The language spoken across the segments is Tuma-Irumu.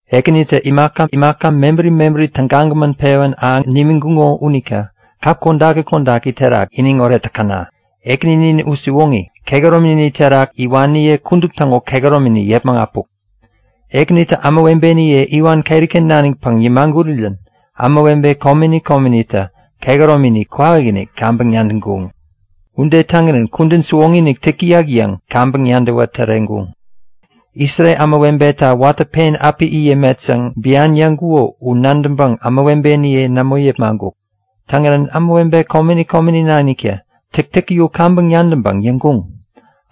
Ekänitä imaka mebäri mebäri tägagämän pewän ahäŋ nimiŋkuŋo unita kap kodaki kodaki terak iniŋoret täkäna! Ekäninin u siwoŋi, kehäromini terak iwaniye kudup täŋo kehäromini yäpmäŋ äpuk. Ekänitä ämawebeniye iwan keriken nanikpäŋ yämagurirän ämawebe komeni komenitä kehäromini kwawakinik kaŋpäŋ nadäŋkuŋ. Ude täŋirän kudän siwoŋi-inik täk täyak yäŋ kaŋpäŋ nadäwä täreŋkuŋ. Isrel ämawebeta watä pen api it yämet yäŋ bian yäŋkuko u nadäŋpäŋ ämawebeniye nämo yepmaŋkuk. Täŋirän ämawebe komeni komeni naniktä täktäki u kaŋpäŋ nadäŋpäŋ yäŋkuŋ;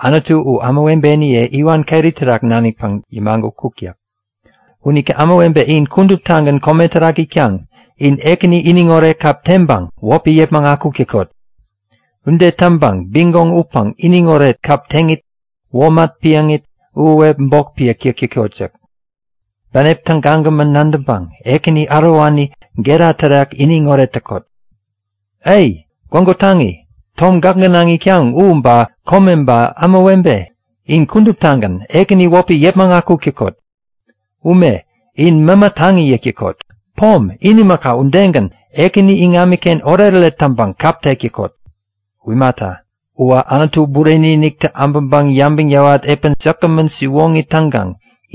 Anutu u ämawebeniye iwan keri terak nanikpäŋ yämagutkuk yäk. Unita ämawebe in kuduptagän kome terak itkaŋ, in Ekäni iniŋoret kap teŋpäŋ wäpi yäpmäŋ akuk täkot! Ude täŋpäŋ bigoŋ utpäŋ iniŋoret kap teŋit womat piäŋit, uhuwep bok piäk täkot yäk. Bänep tägagämän nadäŋpäŋ Ekäni ärowani gera terak iniŋoret täkot! Ai! Gwägu taŋi, tom gäk gänaŋ itkaŋ u ba kome ba ämawebe, in kuduptagän Ekäni wäpi yäpmäŋ akuk täkot! Ume, in mämä taŋi yäk täkot! Pom, in imaka udegän, Ekäni iŋamiken oretoret täŋpäŋ kap tek täkot! U imata, uwä Anutu Bureni-iniktä äbäŋpäŋ yabäŋ yäwat epän säkgämän siwoŋi täŋkaŋ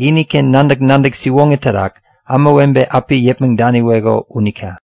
iniken nadäk-nadäk siwoŋi terak ämawebe api yäpmäŋ daniweko unita!